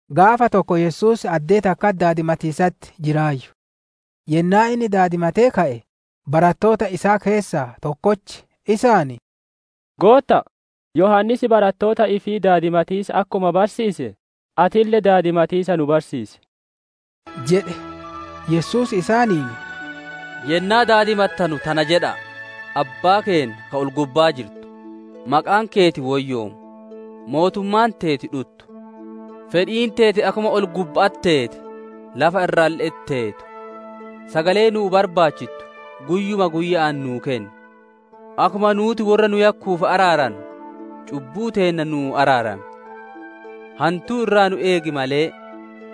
Gaafa tokko Yesuus addee takkatti daadimatiisatti jiraayyu; yennaa inni daadimatee ka'e, barattoota isaa keessaa tokkochi isaan, «Gootta'a, Yohaannis barattoota ifii daadimatiisa akkuma barsiise, atille daadimatiisa nu barsiisi» jedhe. Yesuus isaaniin, «Yennaa daadimattanu tana jedha'a: «‹Abbaa keenna, [ka ol-gubbaa jirtu] Maqaan keeti woyyoomu; Mootummaan teeti dhuttu. [Fedhiin teeti akkuma ol-gubba'atti teete, lafa irralle'etti teetuu.] Sagalee nuu barbaachittu guyyuma guyya'aan nuu kenni. Akkuma nuuti worra nu yakkuuf araarannu, cubbuu teenna nuu araarami; [hantuu irraa nu eegi malee],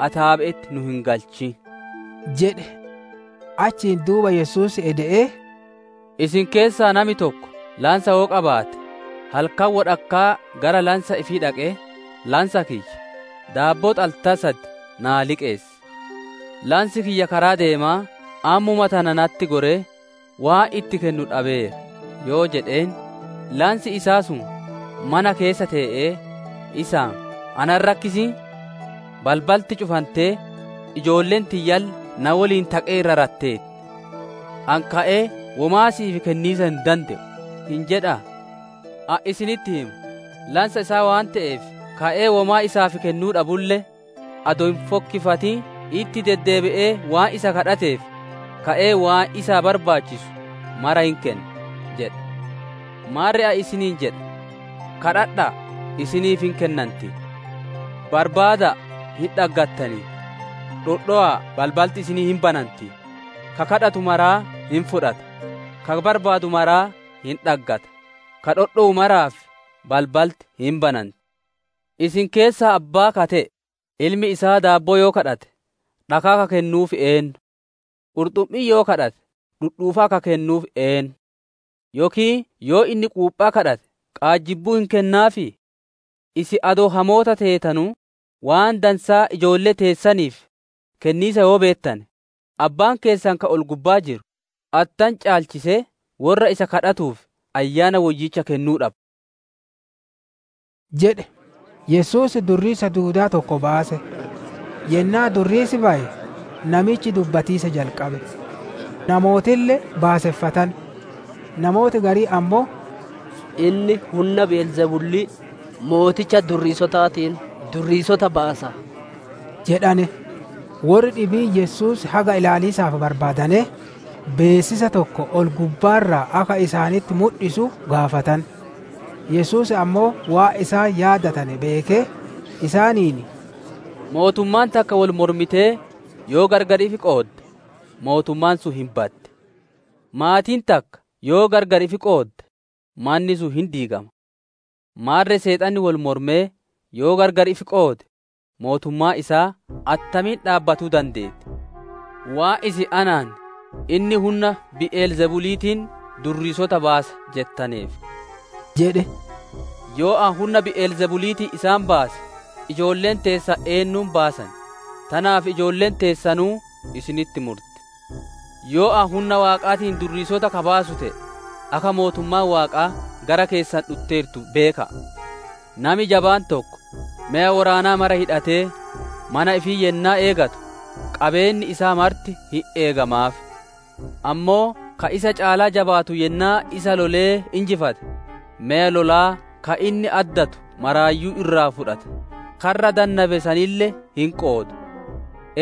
ataabe'etti nu hin galchin!› jedha'a» jedhe. Achiin duuba Yesuus ede'ee «Isin keessaa nami tokko lansa yoo qabaate, halkan wodhakkaa gara lansa ifii dhaqee ‹Lansa kiyya, daabboo xaltaa sad naa liqeessi. Lansi kiyya karaa deemaa ammuma tana natti goree waan itti kennu dhabeera› yoo jedheen, lansi isaa sun mana keessa tee'ee, isaan ‹Ana hin rakkisin! Balbalti cufantee, ijoolleen tiyyalle na woliin taqee irra ratteerti. Ani ka'ee womaa si'iif kenniisa hin dande'u› hin jedhaa? Ani isinitti hima, lansa isaa waan te'eef ka'ee womaa isaaf kennuu dhabulle, adoo hin fokkifatin itti deddeebisee waan isa kadhateef, ka'ee waan isaa barbaachisu mara hin kenna. «Maarre ani isiniin jedha: gaafadha'a isiniif hin kennanti; barbaada'a hin dhaggattani; dhodhowa'a balbalti isiniif hin bananti. Ka gaafatu maraa hin fudhata; ka barbaadu maraa hin dhaggata; ka dhodhowu maraaf balbalti hin bananti. Isin keessaa abbaa ka te'e, ilmi isaa [daabboo yoo gaafate dhakaa ka kennuuf eennu?] Qurxummii yoo gaafate dhudhuufaa ka kennuuf eennu? Yookiin yoo inni quuphaa gaafate qaajjibbuu hin kennaafii? Isin adoo hamoota teetanuu, waan dansaa ijoollee teessaniif kenniisa yoo beettane, Abbaan keessan ka ol-gubbaa jiru, attam caalchisee worra isa gaafatuuf Ayyaana Woyyicha kennuu dhaba!» jedhe. Yesuus durriisa duudaa tokko baase. Yennaa durriisi baye, namichi dubbatiisa jalqabe; namootille baaseffatane. Namooti gariin ammoo, «Inni hunna Bi'el Zebulii mooticha durriisotaatiin durriisota baasa» jedhane. Worri dhibiin Yesuus haga ilaaliisaaf barbaadanee, beessisa tokko ol-gubbaa irraa akka isaanitti mudhisu gaafatan. Yesuus ammoo waan isaan yaadatane beekee, isaaniin, «Mootummaan takka wol mormitee yoo gargar ifi qoodde, mootummaan sun hin baddi; maatiin takka yoo gargar ifi qoodde, manni sun hin diigama. Maarre Seexanni wol mormee yoo gargar ifi qoode, mootummaan isaa attamiin dhaabbatuu dandeetti? Waan isin anaan, ‹Inni hunna Bi'el Zebuliitiin durriisota baasa› jettaneef tana jedhe. Yoo ani hunna Bi'el Zebuliitiin isaan baase, ijoolleen teessan eennuun baasan? Tanaaf ijoolleen teessanuu isinitti murti. Yoo ani hunna Waaqaatiin durriisota ka baasu te'ee, akka mootummaan Waaqaa gara keessan dhutteertu beeka'a. «Nami jabaan tokko, meya woraanaa mara hidhatee, mana ifii yennaa eeggatu, qabeenni isaa marti hin eegamaaf. Ammoo ka isa caalaa jabaatu yennaa isa lolee injifate, meya lolaa ka inni addatu maraayyuu irraa fudhata, karra dannabe sanille hin qooda.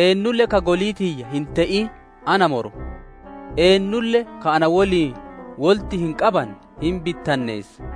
Eennulle ka golii tiyya hin te'in na morma; eennulle ka na woliin wolitti hin qanne hin bittinneessa.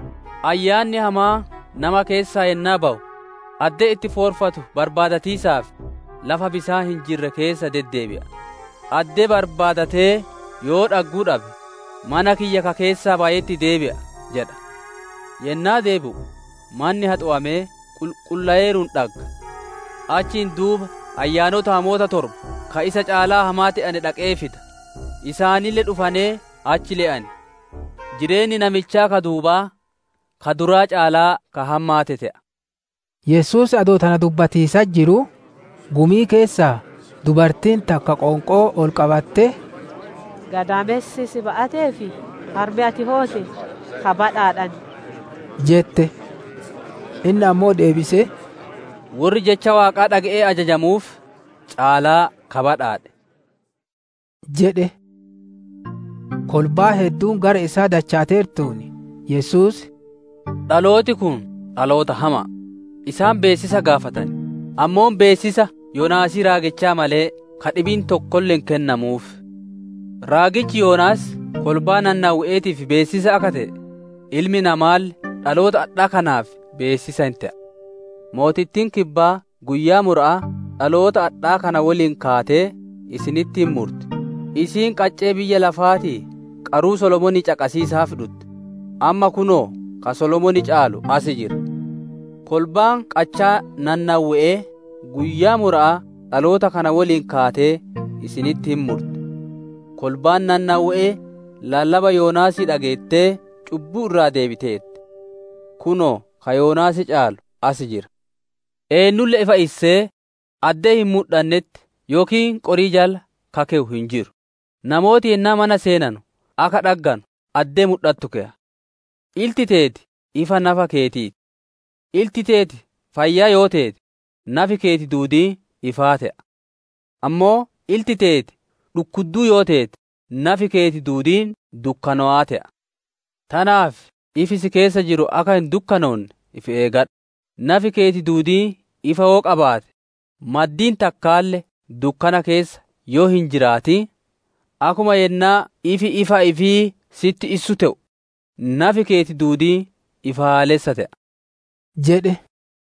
«Ayyaanni hamaan nama keessaa yennaa bawu, addee itti foorfatu barbaadatiisaaf, lafa bisaan hin jirre keessa deddeebi'a; addee barbaadatee yoo dhagguu dhabe, ‹Mana kiyya ka keessaa bayetti deebi'a› jedha. Yennaa deebi'u, manni haxowamee qulqulloweeruun dhagga. Achiin duuba ayyaanota hamoota torba ka isa caalaa hamaa te'ane dhaqee fida; isaanille dhufanee achi le'an. Jireenni namichaa ka duubaa ka duraa caalaa ka hammaate te'a» jedhe. Yesuus adoo tana dubbatiisatti jiruu, gumii keessaa dubartiin takka qoonqoo ol qabattee, «Gadaamessi si ba'atee fi harmi ati hoote ka badhaadhane» jette. Inni ammoo deebisee, «Worri jecha Waaqaa dhage'ee ajajamuuf caalaa ka badhaadhe!» jedhe. Kolbaan hedduun gara isaa dachaateertuun, Yesuus, «Dhalooti kun dhaloota hama'a; isaan beessisa gaafatan, ammoo beessisa Yoonaasii raagichaa malee ka dhibiin tokkolle hin kennamuuf. Raagichi Yoonaas kolbaa Nanawwe'eetiif beessisa akka te'e ilmi namaalle dhaloota adhaa kanaaf beessisa hin te'a. Mootittiin kibbaa guyyaa mura'aa dhaloota adhaa kana woliin kaatee, isaanitti hin murti. Isiin qaccee biyya lafaatii qaruu Solomoonii caqasiisaaf dhutte; amma kunoo ka Solomoon caalu as jira. Kolbaan qachaa Nanawwe'ee guyyaa mura'aa dhaloota kana woliin kaatee isinitti hin murti; kolbaan Nanawwe'ee lallaba Yoonaasii dhageettee cubbuu irraa deebiteerti. Kunoo ka Yoonaas caalu as jira. «Eennulle ifa issee, addee hin mudhannetti yookiin qorii jala ka keyu hin jiru; namooti yennaa mana seenanu akka dhagganu addee mudhatu keya. Ilti teeti ifa nafa keetii ti; ilti teeti fayyaa yoo teete, nafi keeti duudiin ifaa te'a; ammoo ilti teeti dhukkudduu yoo teete nafi keeti duudiin dukkanowaa te'a. Tanaaf ifi si keessa jiru akka hin dukkanoonne ifi eegadhu. Nafi keeti duudiin ifa yoo qabaate, maddiin takkaalle dukkana keessa yoo hin jiraatin, akkuma yennaa ifi ifa ifii sitti issu te'u, nafi keeti duudiin ifaalessa te'a» jedhe.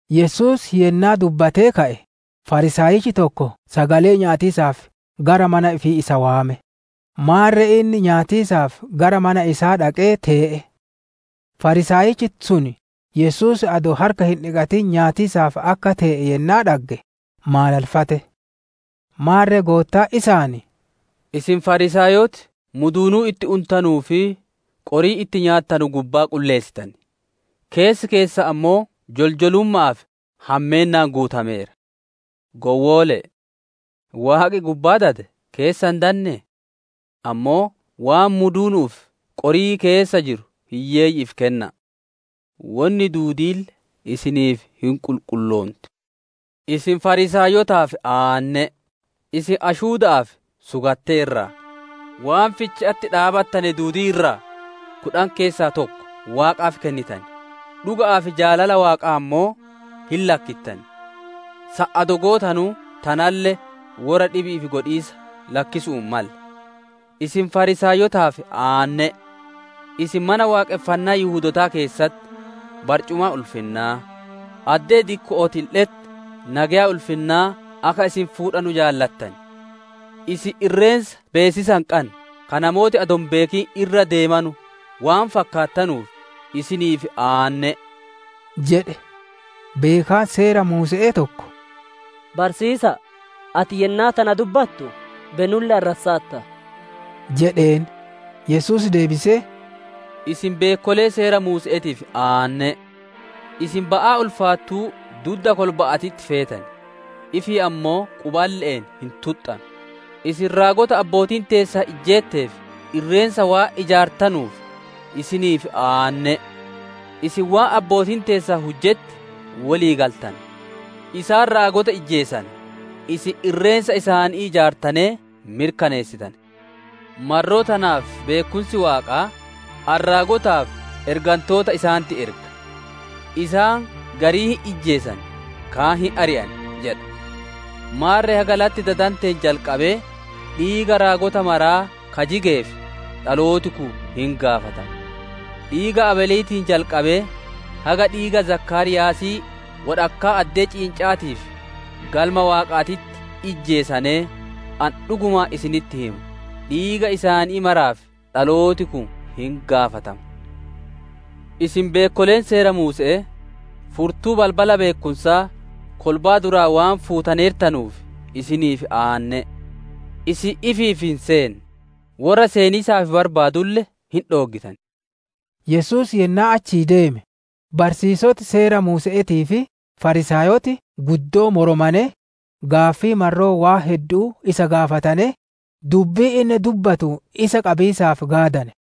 Yesuus yennaa dubbatee ka'e, Fariisaayichi tokko sagalee nyaatiisaaf gara mana ifii isa waame; maarre inni nyaatiisaaf gara mana isaa dhaqee tee'e. Fariisaayichi sun Yesuus adoo harka hin dhiqatin nyaataaf akka tee'e yennaa dhagge maalalfate. Maarre Goottaan isaan, «Isin Fariisaayoti muduunuu itti untanuu fi qorii itti nyaattanu gubbaa qulleessitan, keessi keessan ammoo joljolumma'aa fi hammeennaan guutameera. Gowwoole'e! Waaqi gubbaa dade keessa hin dannee? Ammoo waan muduunu'uu fi qorii keessa jiru hiyyeeyyi'iif kenna'a, wonni duudiille isiniif hin qulqulloonti. «Isin Fariisaayotaaf aanne'e! Isin ashuuda'aa fi sugattee irraa, akkasuma waan ficha'atti dhaabattane duudii irraa kudhan keessaa tokko Waaqaaf kennitan, dhuga'aa fi jaalala waaqaa ammoo hin lakkittan. San adoo gootanuu tanalle worra dhibi'iif godhiisa lakkisuu hin malle. Isin Fariisaayotaaf aanne'e! Isin Mana Waaqonfannaa Yihudootaa keessatti barcumaa ulfinnaa, addee dikko'ootille'etti nageya ulfinnaa akka isin fuudhanu jaalattan. Isin irreensa beessisa hin qanne ka namooti adoo hin beekin irra deemanu waan fakkaattanuuf isiniif aanne'e!» jedhe. Beekaan Seera Muuse'ee tokko, «Barsiisaa, ati yennaa tana dubbattu be nu'ulle arrassaarta» jedheen. Yesuus deebisee, «Isin beekkolee Seera Muuse'eetiif aanne'e! Isin ba'aa ulfaattuu dudda kolba'aatitti feetan, ifii ammoo quballe'een hin tuxxanu. Isin raagota abbootiin teessan ijjeetteef irreensa waan ijaartanuuf, isiniif aanne'e! Isin waan abbootiin teessan hujjetti wolii galtane; isaan raagota ijjeesanee, isin irreensa isaanii ijaartanee mirkaneessitane. Marroo tanaaf beekkumsi Waaqaa, ‹Ani raagotaa fi ergantoota isaanitti erga; isaan garii hin ijjeesan kaan hin ari'an› jedha. Maarre haga latti dadanteen jalqabee dhiiga raagota maraa ka jigeef dhalooti kun hin gaafatama. Dhiiga Abeeliitiin jalqabee haga dhiiga Zakaariyaasii wodhakkaa addee ciinca'aatii fi Galma Waaqaatitti ijjeesanee, ani dhugumaan isinitti hima, dhiiga isaan maraatiif dhalooti kun hin gaafatama. Isin beekkoleen Seera Muuse'ee, furtuu balbala beekkumsaa kolbaa duraa waan fuutaneertanuuf, isiniif aanne'e! Isin ifiif hin seenne, worra seeniisaaf barbaadulle hin dhooggitan» jedhe. Yesuus yennaa achii deeme, barsiisoti Seera Muuse'eetii fi Fariisaayoti guddoo moromanee, gaaffii marroo waan heddu'uu isa gaafatanee, dubbii inni dubbatuun isa qabiisaaf gaadane.